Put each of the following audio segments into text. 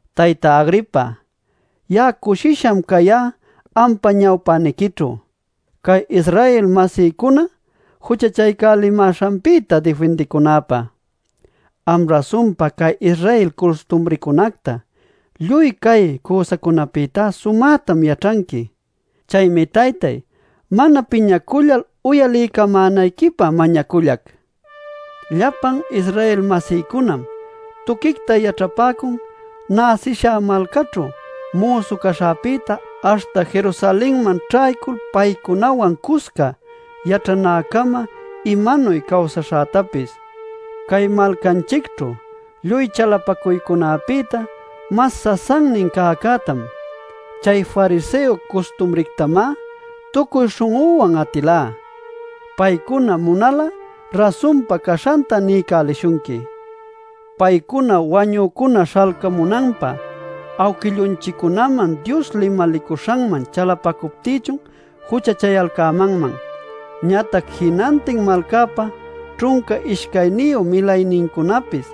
“Tayta Agripa, ya'a cushisham cayá ampa ñawpäniquićhu, cay Israel-masïcuna juchachapämäśhanpïta difindicunäpä. Am rasunpa cay Israel custumrïcunacta, lluy cay cüsacunapïta sumätam yaćhanqui. Chaymi Taytay mana piñacullal uyaliycamänayquipä mañacullac. “Llapan Israel-masïcunam tuquicta yaćhapäcun näsishá malcaćhu müsu caśhäpïta aśhta Jerusalenman ćhaycul paycunawan cusca yaćhanäcama imanuy cawsaśhätapis. Cay malcanchicćhu lluy chalapacuycunapïta mas sasannin cäcätam, chay fariseo custumrictamá tucuy śhun'üwan atilá. Paycuna munal'a rasunpa caśhanta niycälishunqui. Paycunanu wañücuna śhalcamunanpä awquillunchiccunaman Dios limalicuśhanman chalapacuptïchun juchachayalcämanman. Ñatac jinantin malcäpa ćhunca ishcayniyu milaynincunapis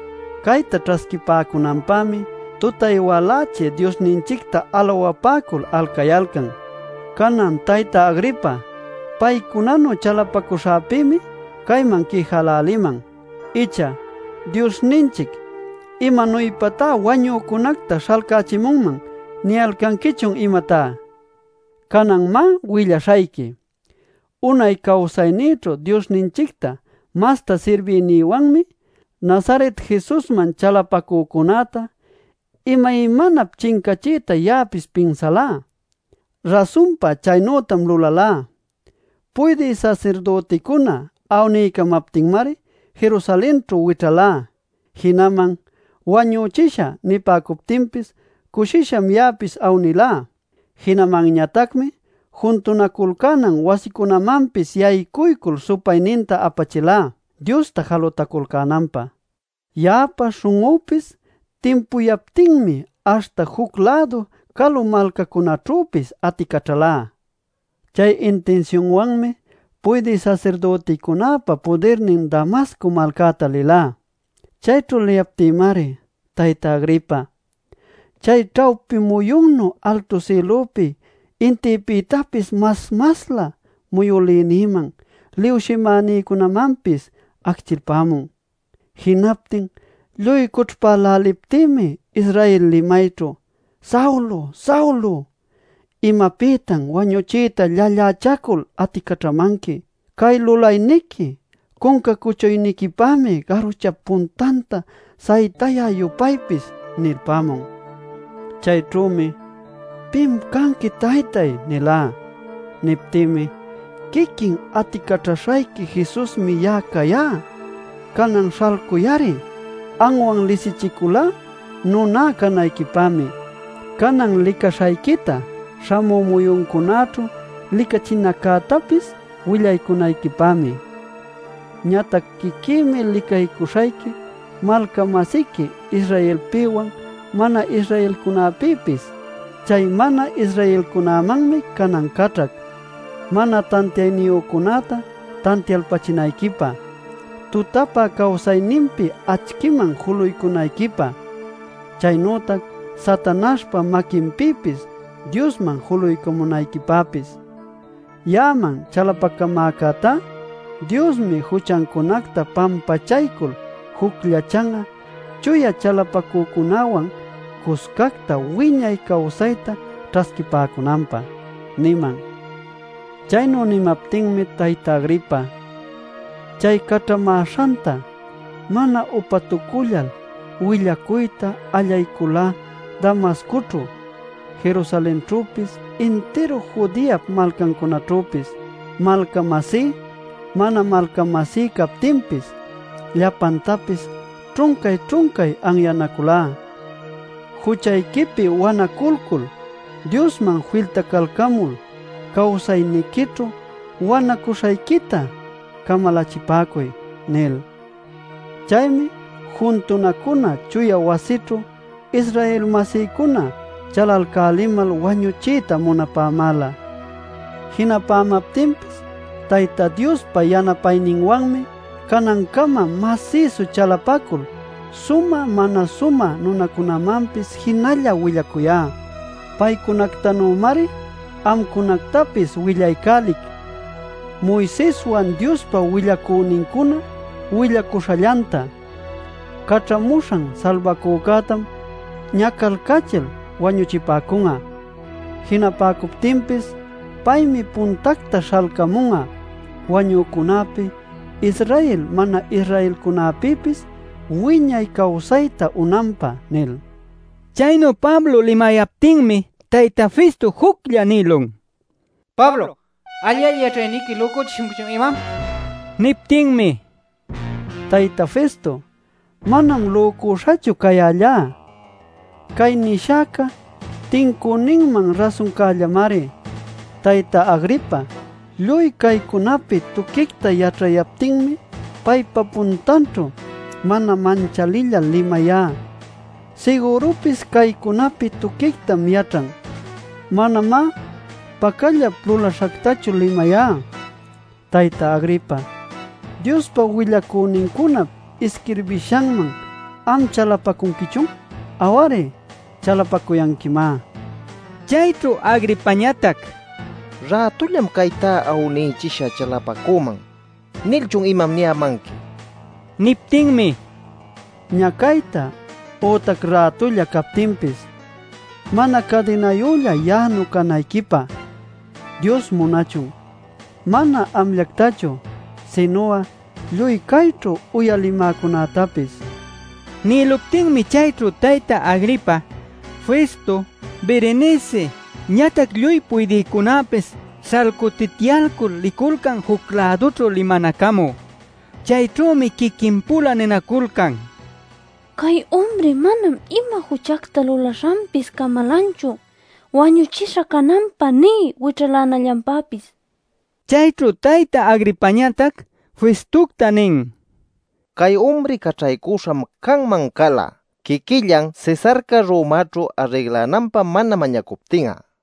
cayta ćhasquipäcunanpämi tutay-walächi Diosninchicta alawapäcul alcayalcan. Canan, Tayta Agripa, paycunanu chalapacuśhäpïmi cayman quijäläliman. Icha ¿‘Diosninchic ¡¿imanuypatá wañücunacta śhalcachimunman?!’ niyalcanquichun imatá? “Cananmá willaśhayqui. Unay cawsaynïćhu Diosninchicta masta sirbiynïwanmi Nazaret Jesusman chalapacücunäta imaymanap chincachiyta ya'apis pinsalá. Rasunpa chaynütam lulalá. Puydï sasirdüticuna awniycamaptinmari Jerusalenćhu wićhalá. Jinaman ‘Wañuchishä’ nipäcuptinpis cushisham ya'apis awnilá. Jinamanñatacmi juntunaculcänan wasicunamanpis yaycuycul supayninta apachilá Diosta jalutaculcänanpä. Ya'apa śhun'üpis timpuyaptinmi aśhta juc-lädu calu malcacunaćhüpis aticaćhalá. “Chay intinsiunwanmi puydï sasirdüticunäpa pudirnin Damasco malcäta lilá. Chayćhu liyaptïmari, Tayta Agripa, chay ćhawpi muyunnu altu sïlupi intïpïtapis mas-maslä muyülïnïman liwshimänïcunamanpis acchilpämun. Jinaptin lluy cućhpäläliptïmi Israel limayćhu: ‘Saulo, Saulo, ¿imapïtan wañuchiyta llallächacul aticaćhamanqui? Cay lulayniqui cunca cuchuyniquipämi garuchap puntanta saytäcä-yupaypis’ nilpämun. “Chayćhümi: ‘¿Pim cayanqui taytay?’ nilá. “Niptïmi: ‘Quiquin aticaćhaśhayqui Jesusmi ya'a cayá. Canan śhalcuy-ari. Anwan lisichiculá nuná canayquipämi, canan licaśhayquita śhamü muyuncunäćhu licachinaccätapis willacunayquipämi. Ñatac quiquïmi licaycuśhayqui malca-masiqui Israelpïwan mana-Israelcunapïpis. Chay mana-Israelcunamanmi canan caćhac mana tantiayniyücunäta tantiaycachinayquipä, tutapä cawsayninpi acchïman julaycamunayquipä, chaynütac Satanaśhpa maquinpïpis Diosman julaycamunayquipäpis. Ya'aman chalapacamäcätá Diosmi juchancunacta pampachaycul jucllachan'a chuya chalapacücunäwan cuscacta wiñay cawsayta ćhasquipäcunanpä’ niman. “Chaynu nimaptinmi, Tayta Agripa, chay caćhamäśhanta, mana upatucullal willacuyta allayculá Damascoćhu, Jerusalenćhüpis intiru Judeap malcancunaćhüpis. Malca-masí, mana malca-masí captinpis, llapantapis ćhuncay-ćhuncay anyanaculá: ‘Juchayquipi wanaculcul Diosman filtacalcämul cawsayniquićhu wanacuśhayquita camalachipäcuy’ nil. Chaymi juntunacunan chuya wasićhu Israel-masïcuna chalalcälimal wañuchiyta munapämäla. Jinapämaptinpis Tayta Diospa yanapayninwanmi canancama masïsu chalapacul sumä mana sumä nunamanpis jinalla willacuyá. Paycunactanümari amcunactapis willaycälic Moiseswan Diospa willacünincuna willacuśhallanta: ‘Caćhamuśhan Salbacücätam ñacalcachil wañuchipäcun'a. Jinapäcuptinpis paymi puntacta śhalcamun'a wañücunäpi Israel mana-Israelcunactapis wiñay cawsayta unanpä’ nil” nila. Chaynu Pablo limayaptinmi tayta Festo juclla nïlun: “Pablo, alli-alli yaćhayniqui ¡¿lücuchishunquichun imam?!” nil. Niptinmi: “Tayta Festo, manam lücüśhachu cayällá. Cay nishäca tincüninman rasuncällamari. Tayta Agripa lluy caycunapi tuquicta yaćhayaptinmi paypa puntanćhu mana manchalillal limayá. Sigürupis caycunapi tuquictam yaćhan. Manamá pacallap lulaśhactachu limayá. Tayta Agripa, ¿Diospa willacünincunap isquirbishanman am chalapacunquichun? Aw-ari, chalapacuyanquimá” nin. Chayćhu Agripañatac: “¿‘Rätullam caytá awnichishä chalapacüman’ nilchun imam niyämanqui?” nin. Niptinmi: “Ñacayta ütac rätulla captinpis, mana cadinayülla ya'anu canayquipä Dios munachun, mana amllactachu, sinu'a lluy cayćhu uyalimäcunätapis” nila. Nïluptinmi chayćhu tayta Agripa, Festo, Berenice ñatac lluy puydïcunäpis śhalcutityalcul liculcan juc-lädućhu limanacamü. Chayćhümi quiquin-pula ninaculcan: “Cay umri manam ima juchacta lulaśhanpis camalanchu wañuchisha cananpä nï wićhalänallanpäpis” nil. Chayćhu tayta Agripañatac Festocta nin: “Cay umri caćhaycuśham canman cala quiquillan Cesarca Romaćhu arrinlananpä mana mañacuptin'a” nil.